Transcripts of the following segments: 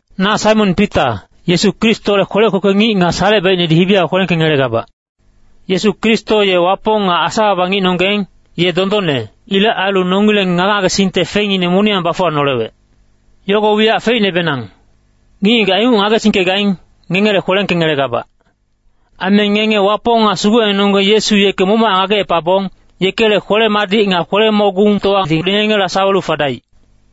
Na Saimon Pita, Yesu Kristole kwelec kwekwe ngic nga salecebaicnedi hibi yago kwelengkengelegabac. Yesu Kristo ye Wapong nga Asa-baba ngicnonggeng, ye dondonne. Ilec ailu nongileng ngage-ngagesingte fengngine moniyang bafuwanolewec. Yogo wiyac feicnebenang. Ngic-ngigac inguc ngagesingkegaing, ngengele kwelengkengelegabac. Aime ngenge Wapong nga Sugucnenonggeng Yesu yeke momochac ngagecepabong, yekele kwele-madic nga kwele-mogungtowadi ngengela sawelu fadaic.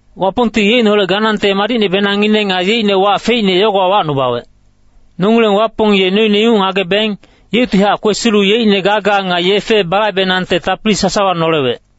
Wapongti yeicneholec ganangte madicnebenangine nga yeicne wac feicne yogowa wacnubawec. Nongileng Wapong ye noine inguc ngagebeng, yeuctihac kwesilu yeicne gaga nga yefe balaibenangte tapili sasawa nolewec.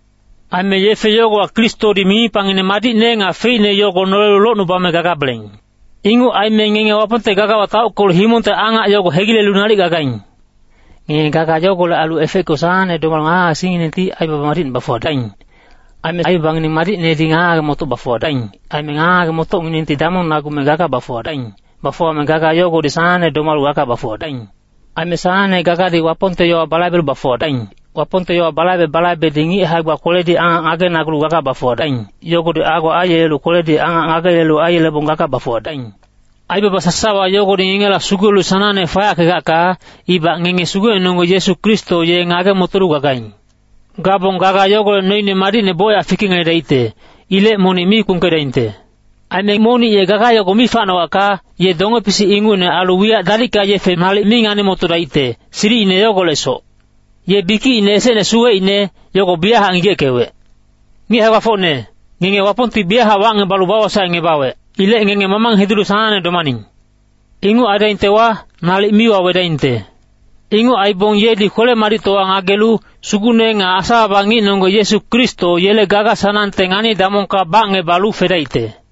Aime yefe yogowa Kristodi mimipangine madicne nga feicne yogo nolelu locnubame gagabeleng. Inguc aime ngenge Wapongte gagawa taockelu himongte angac yogo hegilelu nalic gagaing. Ngenge gaga yogolec ailu efeckelu sanangne domalu ngage-ngagesingnginengti aibaba madicne bafuwadaing. Aime aibabangineng madicnedi ngage-ngage-motoc bafuwadaing. Aime ngage-ngage-motocnginengti damongngebame gaga bafuwadaing. Bafuwame gaga yogodi sanangne gaga bafuwadaing. Aime sanangne gagadi Wapongte yowa balaibelu bafuwadaing. Wapongte yowa balaibe-balaibedi ngic hae-gba kweledi angac ngagenagulu gaga bafuwadaing, yogodi ago aiyelelu kweledi angac ngagelu aiyelebong gaga bafuwadaing. Aibaba sasawa yogodi ngengela sugulelu sanangne fayackegacka, ibac ngenge Sugucnenonggeng Yesu Kristo ye ngage-motolu gagaing. Gabong gaga yogolec noine madicne bocyac fikengeledaicte. Ilec monic mi kpungkedaingte. Aime monic ye gaga yogo mi facnogacka, ye donge-pisic ingucne ailu wiyac dalicka yefe nalic mi ngani-motodaicte, silicine yogolecsoc. Ye bikicine esecne suweicne, yogo biyachac ngigeckewec. Ngic hae-gbafocne, ngenge Wapongti biyachac wacngebalu bawosaecngebawec. Ilec ngenge mamang hidulu sanangne domaning. Inguc aidaingtewa, nalic mi wawedaingte. Inguc aibong yedi kwele-madictowa aingelelu, Sugucne nga Asa-baba ngicnonggeng Yesu Kristo yele gaga-sanangte ngani-damongka bacngebalu fedaicte.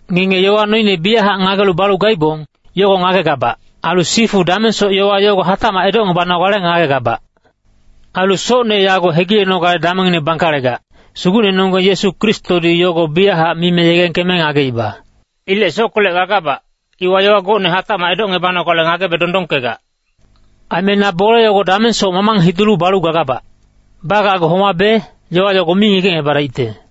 Ngenge yowa noine biyachac ngagelu balu gaibong, yogo ngagegabac. Ailu sifu damengsoc yowa yogo hatacmac edocngebanogale ngagegabac. Ailu socne yago hegilenogale damengngine bangkalegac, Sugucnenonggeng Yesu Kristodi yogo biyachac mime yegengkeme ngageiba. Ilec sockolec gagabac, iwa yowa gocne hatacmac edocngebanogale ngagebe dondongkegac. Aime na bole yogo damengsoc mamang hidulu balu gagabac. Bagacgu homabe, yowa yogo mi ngigecngebadaicte.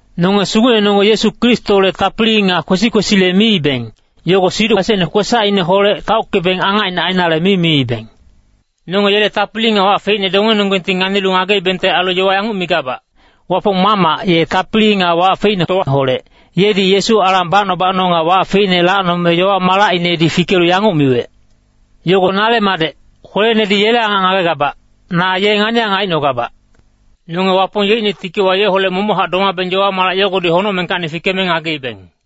Nonge Sugucnenonggeng Yesu Kristole tapili nga kwesi-kwesile miibeng, yogo siduc esecne kwesacineholec taockebeng angacine ainale mi miibeng. Nonge yele tapili nga wac feicne dongenonggengti nganilu ngageibengte ailu yowa yanguc migabac. Wapong Mamac, ye Tapili nga Wac feicnetowaholec, yedi Yesu alang bacno-bacno nga wac feicne lacnome yowa-malacinedi fikelu yanguc miwec, “Yogo nale Madec, kwelenedi yele angac ngagegabac. Na ye ngani-angac aicnogabac.” Nonge Wapong yeicne tikiwa yeholec momochac domabeng yowa-malac yogodi honocmengkacni fikeme ngageibeng.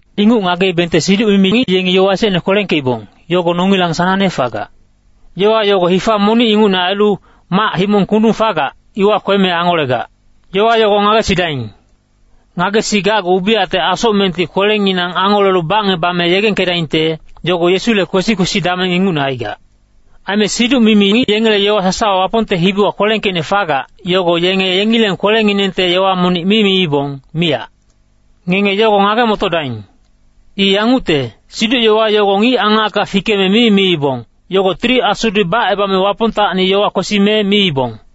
Inguc ngageibengte siduc-mimi ngic yengi yowa esecne kwelengkeibong, yogo nongilang sanangne fagac. Yowa yogo hifa monic ingucne ailu, mac-himong kundung fagac, iwa kweme angolegac. Yowa yogo ngagesidaing. Ngagesigacgu ubiyacte asocmengti kwelenginang angolelu bacngebame yegengkedaingte, yogo Yesule kwesi-kwesi dameng ingucne aigac. Aime siduc-mimi ngic yengele yowa sasawa Wapongte hibiwa kwelengkeicne fagac, yogo yenge yengileng kwelenginengte yowa monic mi miibong, miyac. Ngenge yogo ngage-motodaing. I yangucte, siduc-yowa yogo ngic angacka fikeme mi miibong, yogo Tili Asudi bacebame Wapongtacni yowa kwesime miibong.